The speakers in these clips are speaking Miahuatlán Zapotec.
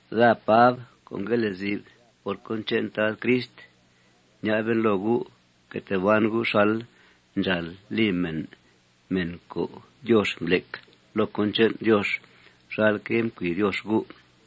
Daa Pab co' ngue lezi'f por cón che'n Tad Crist, ña'ben loo gu': Fque tee ban gu' xal ndxàal li mèn, mèn co' Diox mblec loo cón che'n Diox xalque' mcui Diox gu'.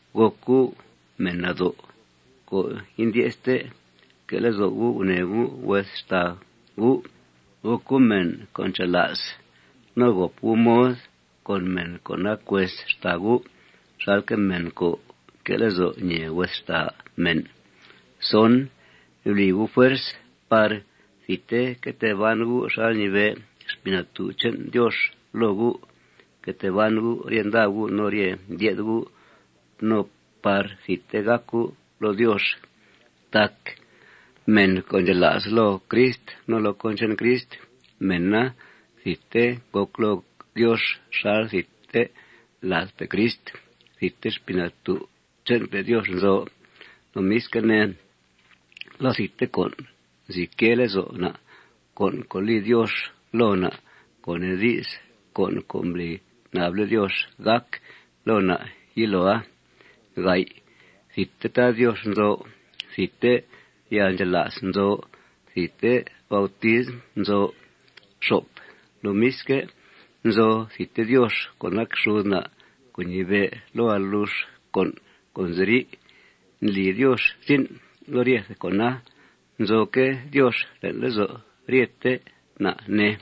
Gòc gu' mèn nado' co' indye'ste. Fque' lezo' gu' gunèe gu' hues xtàa gu'. Gòc gu' mèn co' ncha'la's. No gòp gu' mod con mèn co' nac hues xtàa gu' xalque' mèn co' nque' lezo' ñèe hues xtàa mèn. Bli gu' fuerz par thidte que tee ban gu' xal ñibe' Xpii Natú' che'n Diox loo gu'. Fque tee ban gu' rye nda gu' no rye ndye'th gu' no par thidte gàc gu' loo Diox. Tac mèn co' ndxela's loo Crist no loo cón che'n Crist, mèna thidte ngòc loo Diox xal thidte ladpe' Crist. Thidte Xpii Natú' che'npe' Diox nzo. Lomisque' ne, loo thidte con' nzi quee lezo' na', con' co' li Diox loo na', co' nee di's, con' co' mbli nable' Diox gàc loo na' yiloa. Thidte Tad Diox nzo. Thidte yalndxela's nzo. Thidte bautism nzo. Lomisque', nzo thidte Diox co' nac xud na' co' ñibe' loo alux con' co' nziri'. Ndli Diox zin' loo ryethe con'a. Nzoque' Diox le'n lezo' ryete na', ne.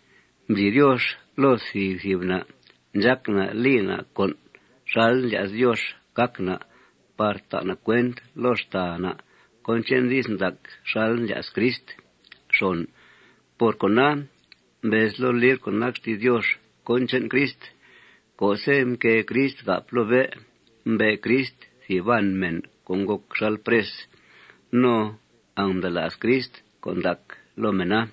Mbli Diox loo thìb thìb na' ndxác na' li na' con' xal ndlya's Diox gác na' par ta' na' cuent loo xtàa na' cón che'n di's ndac xal mblya's Crist. Por cona, mbez loo libr co' nac xti's Diox cón che'n Crist: Co'se' mquée Crist gáp loo bé', mbe' Crist thìb baan mèn co' ngòc xal pres. No angmda'la's Crist con' ndac loo mèna.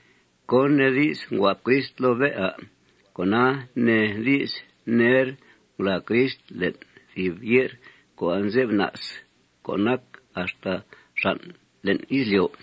¿Cón nee di's nguáp Crist loo bé', à'? Con'a nee di's ner ngulàa Crist le'n thìb ye'r co' anze'f na's co' nac axta xàn' le'n izlyo'.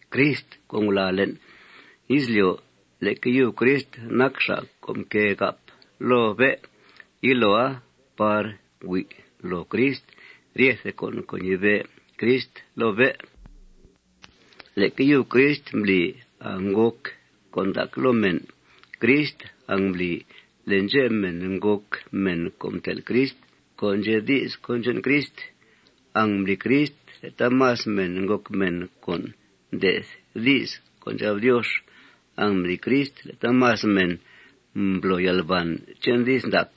Crist co' ngulàa le'n izlyo', leque yub Crist nac xa' co' mquée gáp loo bé' yiloa par hui' loo Crist ryethe con' co' ñibe' Crist loo bé'. Leque yub Crist mbli angngòc con' ndac loo mèn. Crist angmbli le' ndxep mèn ngòc mèn co' mtel' Crist, co' ndxe' di's cón che'n Crist. Angmbli Crist le' taamas mèn ngòc mèn co' nde'th di's co' ndxab Diox. Angmbli Crist le' taamas mèn mblo yalbàn che'n di's ndac.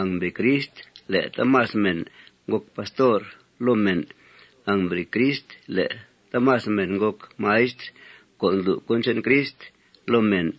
Angmbli Crist le' taamas mèn ngòc pastor loo mèn. Angmbli Crist le' taamas mèn ngòc maistr co' ndlu' cón che'n Crist loo mèn.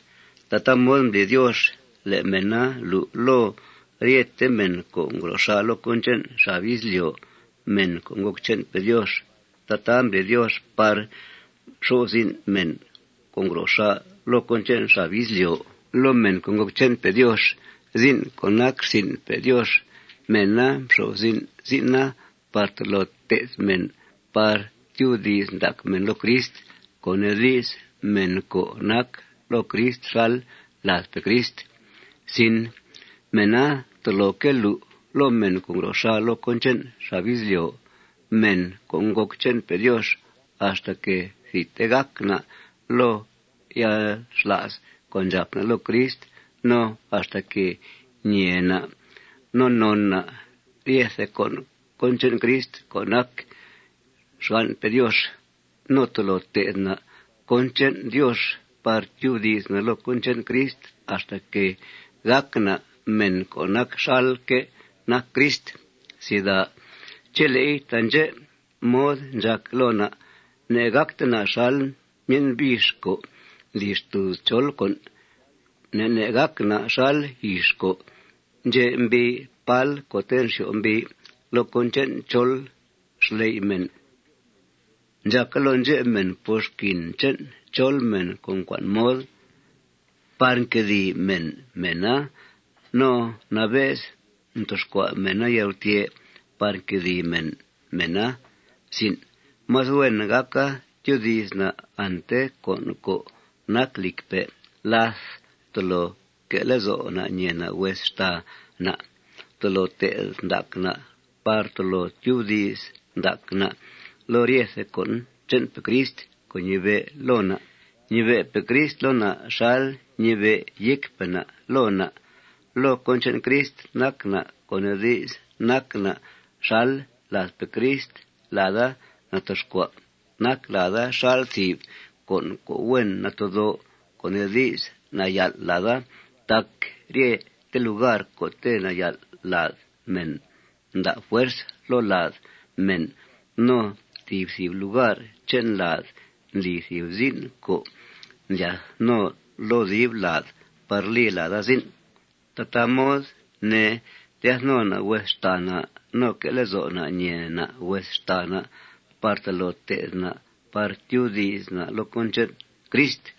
Tataa mod mbli Diox le' mèna lu' loo ryete mèn co' ngro xà' loo cón che'n xab izlyo', mèn co' ngòc che'npe' Diox. Tataa mbli Diox par xo'f zin' mèn co' ngro xà' loo cón che'n xab izlyo', mèn co' ngòc che'npe' Diox, zin' co' nac rsin'pe' Diox. Mèna mxo'f zin' zin'a par tolo té'th mèn par tyubdi's ndac mèn loo Crist, co' nee di's, mèn co' nac loo Crist xal ladpe' Crist. Mèna toloque' lu' loo mèn co' ngro xà' loo cón che'n xab izlyo', mèn co' ngòc che'npe' Diox, axtaque' thidte gàc na' loo yalxla's co' ndxàp na' loo Crist no axtaque' ñee na' no non na' ryethe con' cón che'n Crist co' nac xgan'pe' Diox. No tolo té'th na' cón che'n Diox par tyubdi's na' loo cón che'n Crist axtaque' gàc na' mèn co' nac xalque' nac Crist. Chele'i taandxè' mod ndxàc loo na', ne'gàcte na' xal myen' bix co' ndli xtùuz chol con'. Ne' ne' gàc na' xal yix co' ndxe' mbii pál co'te' nxyo'f mbii loo cón che'n chol xley' mèn. Ndxàca loo ndxep mèn por xquin che'n chol mèn co' mcua'n mod, par nquedìi mèn mèna no nabe's ntoxcua' mèna yalgutyè' par quedìi mèn mèna. Más huen gàca tyoodi's na' ante con' co' nac lìcpe' láth tolo que' lezo' na' ñèe na' hues xtàa na'. Tolo té'th ndac na' par tolo tyubdi's ndac na' loo ryete con' che'npe' Crist co' ñibe' loo na'. Ñibe'pe' Crist loo na' xal ñibe' yécpe' na' loo na'. Loo cón che'n Crist nac na', co' nee di's, nac na' xal ladpe' Crist. Lada natoxcua'. Nac lada xal thìb con' co' huen natedó', co' nee di's, nayal' lada. Tac ryete lugar co'te' nayal' lad mèn nda' fuerz loo lad mèn. No thìb thìb lugar che'n lada ndli thìb zin' co' ndlyath no loo dib lad par li lada zin'. Tataa mod, ne, lyath no na' hues xtàa na' no que' lezo' na' ñèe na' hues xtàa na' par tolo té'th na' par tyubdi's na' loo cón che'n Crist.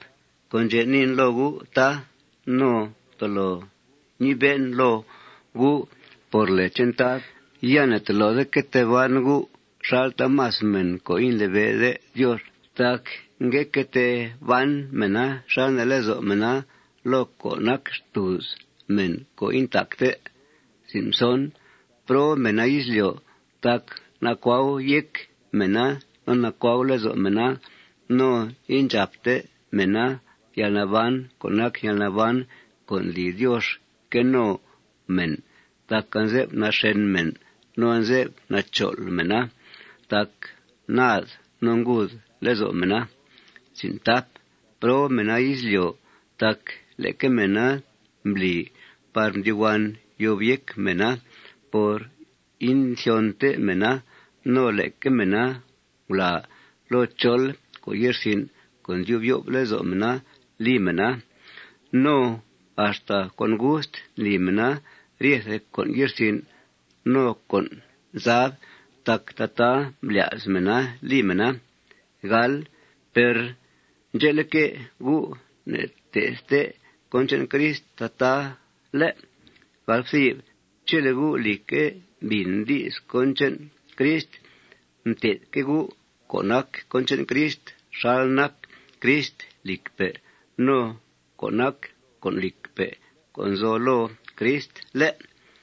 Con' ndxè' niin loo gu', tá, no tolo ñibe'en loo gu' por lèe che'n Tad: Ya ne'tolode que tee ban gu' xal taamas mèn co' indlibe'de Diox. Tac ngue que tee ban mèna xal nee lezo' mèna loo co' nac xtùuz mèn co' intacte. ¡Prob mèna izlyo'! tac nacuau yéc mèna no nacuau lezo' mèna. No indxàpte mèna yalnaban co' nac yalnaban co' ndli Diox que no mèn tac anze'f naxèn mèna no anze'f nachol' mèna tac naad no nguud lezo' mèna. ¡Prob mèna izlyo'! tac leque mèna mbli par mdyuhuan yob yéc mèna por inthyonte mèna. No leque mèna ngulàa loo chol con' ye'rsin' co' ndyub yo'f lezo' mèna li mèna. No axta con gust ndli mèna ryethe con' ye'rsin' no con' zab tac tataa mblya's mèna li mèna. Per ndxe'leque', gu' ne'nté'thte cón che'n Crist tataa, ¿lé'? Chele' gu', lìcque', mbìn di's cón che'n Crist, mté'thque' gu' co' nac cón che'n Crist xal nac Crist lìcpe' no co' nac con' lìcpe' co' nzo loo Crist, ¿lé'?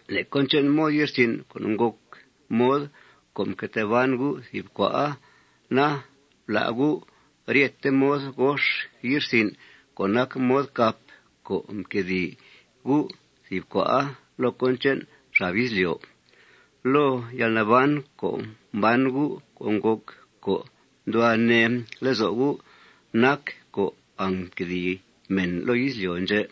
Le' cón che'n mod ye'rsin' co' ngòc mod co' mque tee ban gu' thìb cua'a na, blá' gu' ryete mod gox ye'rsin' co' nac mod cap co' mquedìi gu' thìb cua'a loo cón che'n xab izlyo'. Loo yalnaban co' mban gu' co' ngòc co' nduhua nee lezo' gu', nac co' angnquedìi mèn loo izlyo' ndxè'.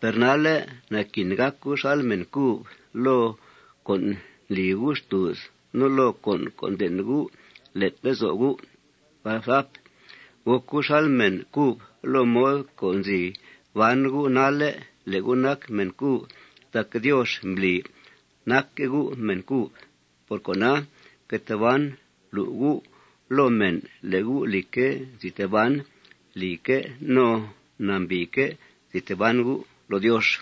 Per nalle' naquin gàc gu' xal mèn cub loo con' co' ndli gu' xtùuz no loo con' co' nden' gu' le'n lezo' gu'. Gòc gu' xal mèn cub loo mod co' nzi ban gu' nalle' le' gu' nac mèn cub tac Diox mbli nacque' gu' mèn cub. Por cona, fque tee ban lu' gu' loo mèn le' gu', lìcque', nzi tee ban lìque' no nambìique' nzi tee ban gu' loo Diox.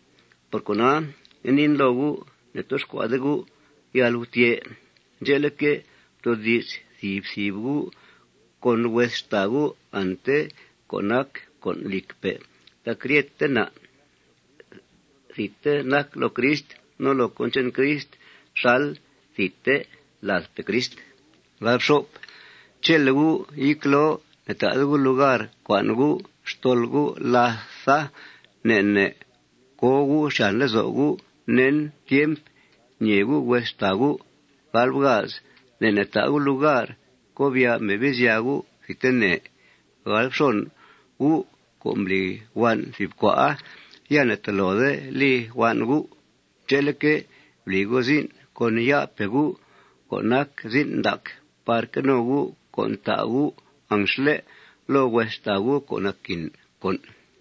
Por cona, ngue niin loo gu': Ne'toxcua'de gu' yalgutyè'. Ndxe'leque', ftoodi's thìb thìb gu' con hues xtàa gu' ante co' nac con' lìcpe' tac ryete na' thidte nac loo Crist no loo cón che'n Crist xal thidte ladpe' Crist. Chele' gu' yecloo, ne'ta'de gu' lugar cua'n gu' xtol gu' látha. Ne' ne' co gu' xyàn lezo' gu' nen tiemp ñèe gu' hues xtàa gu'. Ne' ne' ta' gu' lugar cobya' Mebizya gu' thidtene. Gu' co' mbli huan' thìb cua'a, ya ne'tolode li huan' gu'. Ndxe'leque', bli gu' zin' con ya'pe' gu' co' nac zin' ndac par que no gu' con' ta' gu' anxle' loo hues xtàa gu' co' naquin con'.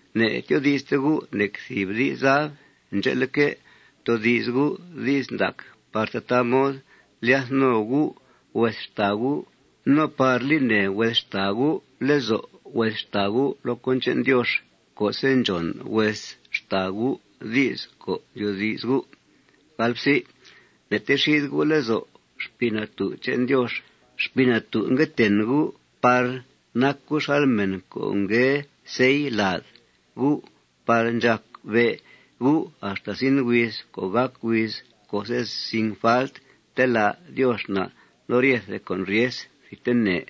Ne'tyoodi'ste gu' nec thìb di's zab. Ndxe'leque', ftoodi's gu' di's ndac par tataa mod lyath no gu' hues xtàa gu' no par li nèe hues xtàa gu' lezo' hues xtàa gu' loo cón che'n Diox co'se' ndxòn hues xtàa gu' di's co' ndyoodi's gu'. Ne'texide gu' lezo' Xpii Natú' che'n Diox. Xpii Natú' ngue ten gu' par nac gu' xal mèn co' ngue sell lad gu' par ndxàc be' gu' axta zin huiz co' gàc huiz co'se', sin falt, telá' Diox na' loo ryethe con' ryes thidtene.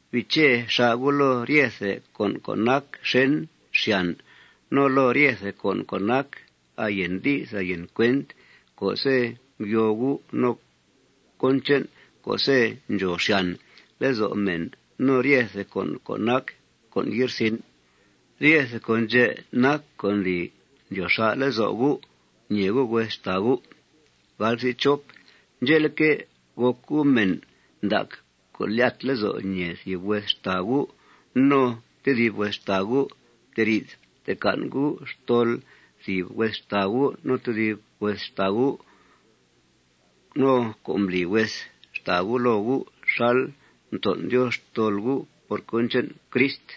Biiche xà' gu' loo ryethe con' co' nac xèn xyàn, no loo ryethe con' co' nac ayen di's ayen cuent co'se' ngyoo gu', no cón che'n co'se' ndxòo xyàn lezo' mèn, no ryethe con' co' nac con' ye'rsin'. Ryethe con' ndxè' nac co' ndli ndyoo xà' lezo' gu' ñèe gu' hues xtàa gu'. Ndxe'leque', gòc gu' mèn ndac co' ndlyat lezo' ñèe thìb hues xtàa gu' no tedib hues xtàa gu'. Fteri'th ftecan' gu' xtol thìb hues xtàa gu' no tedib hues xtàa gu' co' mbli hues xtàa gu' loo gu' xal mton' Diox xtol gu' por cón che'n Crist.